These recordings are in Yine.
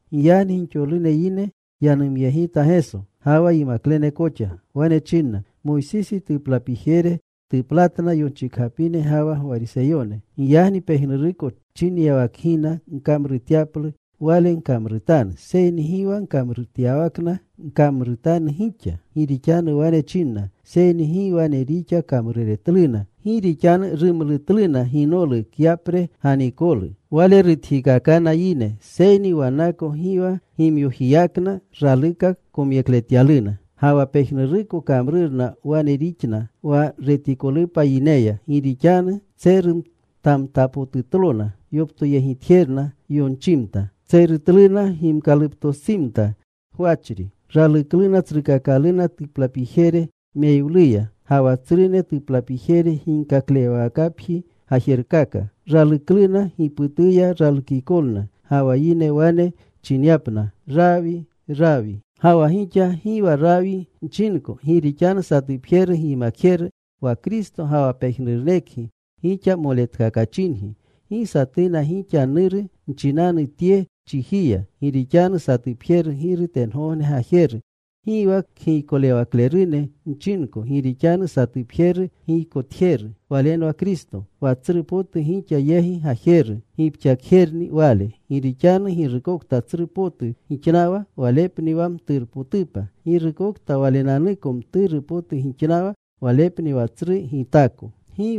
Giyagni gixolune yine yanumyegita Geso, ga wa yimaklene koxa. Wane chinna, “Moysisi tuplapijere tuplatna yonchikgapine ga wa Gwariseyone. Giyagni pejnuruko chinyawakgina gkamrutyaplu, wale gkamrutanu. Seyni gi wa kamrutyawakna gkamrutanu gixa. Gi rixanu wane chinna, seyni gi wane rixa kamruretluna. Gi rixanu rumlutluna ginolu, kyapre ganikolu. Wale rutjikaakana yine. Seyni wannako gi wa gimyojiyakna raluka komyekletyaluna. “Ga wa pejnuruko kamrurna wane rixna wa retikolupa yineya. Gi rixanu tserutamtapotutlona yoptoyegitjerna yonchimta. Tserutluna gimkaluptostsimta gwachri. Ralukluna tsrukakalune tuplapijere meyiwluya, ga wa tsrune tuplapijere ginkaklewawakapji gajerkaka. Ralukluna giputuya ralukikolna, ga wa yine wane chinyapna, ‘Rawii, Rawii.’ “Ga wa gixa gi wa ‘Rawi’ nchinko, gi rixanu satupjeru gyimakjeru wa Kristo ga wa pejnurunekgi gixa moletkakachingi. Gi satuna gixa ‘nuru’ nchinanu tye chijiya, gi rixanu satupjeru Giru tengogne Gajeru. Gi wa kgiykolewaklerune nchinko gi rixanu satupjeru giykotjeru. Walenwa Kristo. Wa tsru potu gixa yegi gajeru, gipxakjerupni wale. Gi rixanu girukokta tsru potu gixnawa, walepni wa mturupotupa. Girukokta walenanuko mturu potu gixnawa walepni wa tsru gitaako. “¡Gi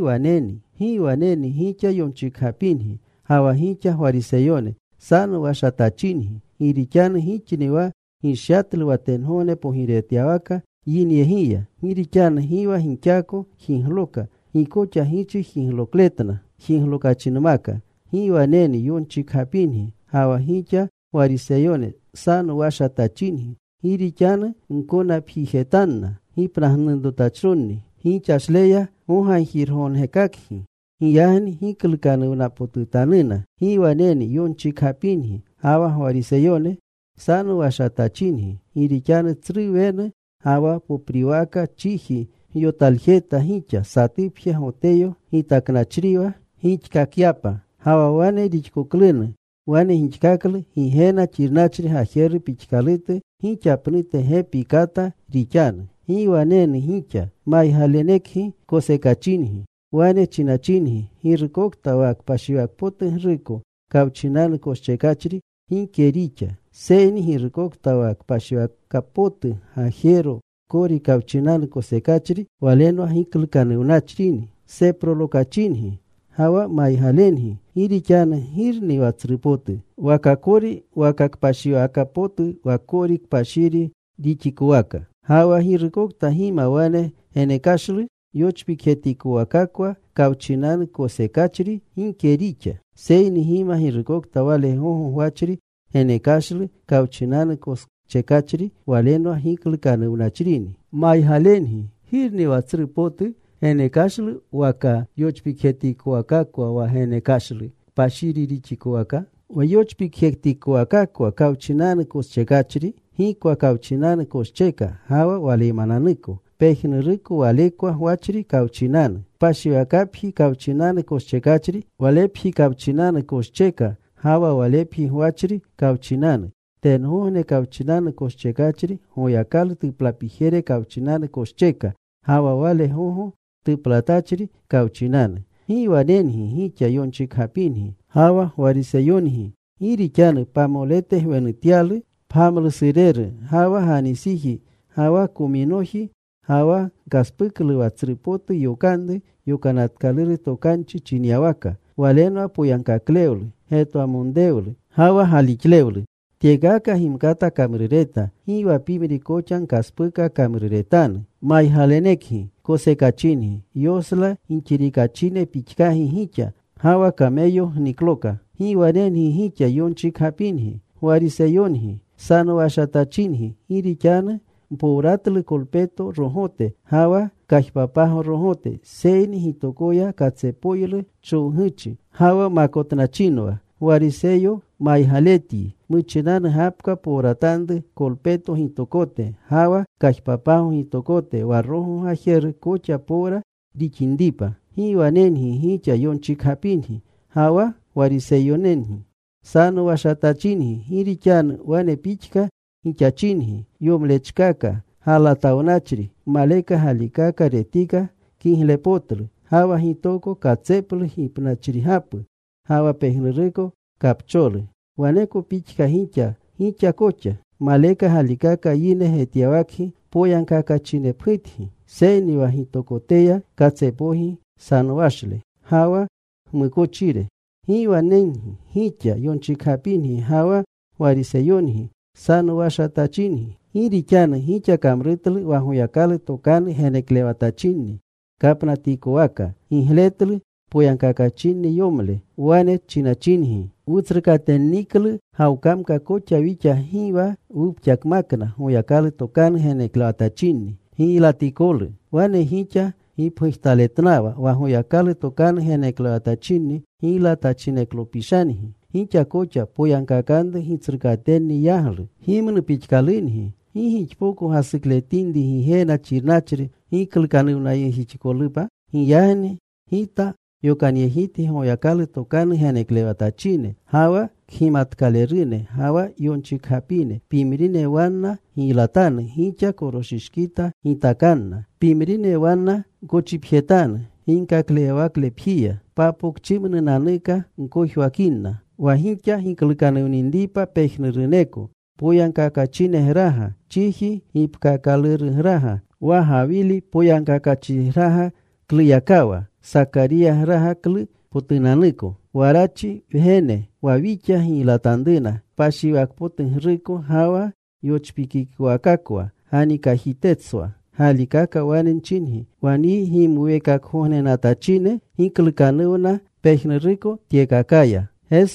waneni gixa yonchikgapingi, ga wa gixa Gwariseyone, sanowashatachingi! Gi rixanu gixni wa gishyatlu wa tengogne pogirewatyawaka yinyegiya. Gi rixanu gi wa gixako jigloka. Gi koxa gichi jiglookakletna jiglokachinmaka. ¡Gi waneni yonchikgapingi, ga wa gixa Gwariseyone sanowashatachingi! Gi rixanu gkonapjijetanna gipnagnurutachronni. Gixashleya gogagjirgognerkakgi. Giyagni giklukanuwnapotutanuna. “¡Gi waneni yonchikgapingi ga wa Gwariseyone, sanowashatachingi! Gi rixanu tsru wenu ga wa popriwaka chiji gyotaljeta gixa, satupje Goteyo gitaknachriwa gixkakyapa. Ga wa wane rixkoklunu, wane gixkaklu Gigena xirnachri gajeru pixkalutu gixa pnute gepi kata rixanu. “¡Gi waneni gixa! Maygalenekgi kosekachingi. Wane chinachingi, ‘Girukokta wa kpashiwakpotugruko kawchinanu koschekachri, gike rixa. Seyni girukokta wa kpashiwaka potu gajero kori kawchinanu koschekachri walenwa giklukanuwnachrini.’ ¡Seprolokachingi ga wa maygalengi! Gi rixanu ¿girni wa tsrupotu? ¿Waka kori waka kpashiwaka potu wa kori kpashiri rixikowaka? Ga wa, Girukokta gima wa genekashlu yochpikjetikowakakwa kawchinanu koschekachri, gike rixa. Seyni gima girukokta wale gogo gwachri genekashlu kawchinanu koschekachri, walenwa giklukanuwnachrini. Maygalengi, ¿girni wa tsru potu: genekashlu waka yochpikjetikowakakwa wa genekashlu kpashiri rixikowaka? Wa yochpikjetikowakakwa kawchinanu koschekachri, gikwa kawchinanu koscheka ga wa waleymananuko pejnuruko walekwa gwachri kawchinanu. Kpashiwakapji kawchinanu koschekachri, walepji kawchinanu koscheka ga wa walepji Gwachri kawchinanu. Tengogne kawchinanu koschekachri, Goyakalu tuplapijere kawchinanu koscheka ga wa wale gogo Tuplatachri kawchinanu. “¡Gi wanengi gixa, yonchikgapingi ga wa Gwariseyongi! Gi rixanu pamolete gwenutyalu pgamlusureru, ga wa ganisiji, ga wa kominoji, ga wa gkaspuklu wa tsru potu yokanru Yokanatkaluru Tokanchi chinyawaka. Walenwa poyagkaklewlu, getwamonrewlu, ga wa galixlewlu. Tyekaka gimkata kamrureta. Gi wa pimri koxa gkaspuka kamruretanu. ¡Maygalenekgi kosekachingi! ¡Yosla gixirikachine pixkagi gixa, ga wa kameyo gnikloka! “¡Gi wanengi gixa, yonchikgapingi, Gwariseyongi! Sanowashatachingi. Gi rixanu mpowratlu kolpeto rogote ga wa kajpapago rogote, seyni gitokoya katsepoylu chowguchi ga wa makotnachinwa. Gwariseyo maygaletyi, muchinanu gapka powratanru kolpeto gitokote ga wa kajpapago gitokote, wa rogo gajeru koxa powra rixinripa. “¡Gi wanengi gixa yonchikgapingi ga wa Gwariseyongi! Sanowashatachingi. Gi rixanu wane pixka gixachingi, yomlechkaka galatawnachri. Maleka galikaka retika kiglepotlu. Ga wa gitoko katseplu gipnachrigapu ga wa pejnuruko kapcholu. Waneko pixka gixa gixa koxa. Maleka galikaka yine getyawakgi poyagkakachinepgutgi. Seyni wa gitokoteya katsepoygi nsanowashle ga wa gmukochire. “¡Gi wanengi gixa, yonchikgapingi ga wa Gwariseyongi! Sanowachatachingi. Gi rixanu gixa kamrutlu wa Goyakalu tokanu geneklewatachinni kapnatikowaka. Gigletlu poyagkakachinni yomle. Wane chinachingi, ‘Wutsrukatenniklu gawkamka koxa wixa, gi wa wupxakmakna Goyakalu tokanu geneklewatchinni giylatikolu.’ Wane gixa gipgujtaletnawa wa Goyakalu tokanu geneklewatachinni giylatachineklopishangi. Gixa koxa poyagkakanru gitsrukatenni yaglu. “¡Gimnu pixkalungi! ¿Gi gixpoko gasukletinri Gigena xirnachri giklukanuwnayegjixikolupa? Giyagni Gita yokanyegitgi Goyakalu tokanu geneklewatachine, ga wa kgimatkalerune, ga wa yonchikgapine. Pimrine wanna giylatanu gixa. Koroshishkita gitakanna. Pimrine wanna gkochipjetanu ginkaklewawaklepjiya. Papokchimnunanuka gkojwakinna. Wa gixa giklukanuwninripa pejnuruneko poyagkakachinegraga, chiji gipkaakalurugraga, wa Gawili poyagkakachrigragakluyakawa Sakariygragaklupotunanuko, Warachi wgene, wa gixa giylatanruna kpashiwakpotugruko ga wa yochpikikowakakwa ganikajiteswa. Galikaka wane nchingi, wa nyi gimuweekakgognenatachine giklukanuwna pejnuruko tyekakaya.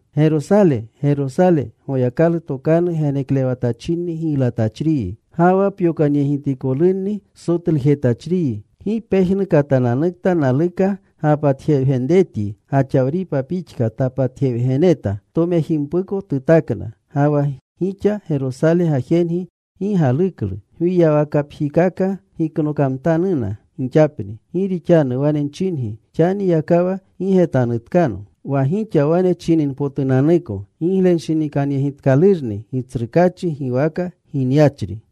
“¡Gerosale, Gerosale! Goyakalu tokanu geneklewatachinni giylatachriyi. Ga wa pyokanyegitikolunni sotlujetachriyi. ¡Gi pejnu katananukta naluka gapatjewgenretyi, gaxawripa pixka tapatjewgeneta! Tomejimpuko tutakna. Ga wa pixa Gesosale gajengi gi galuklu. Gwiyawakapjikaka giknokamtanuna gixapni. Gi rixanu wane nchingi, xaniyakawa gi getanutkanno wa gixa wane chininpotunanuko: Giglenshinikanyegitkalurni Gitsrukaachi giwaka ginyachri.”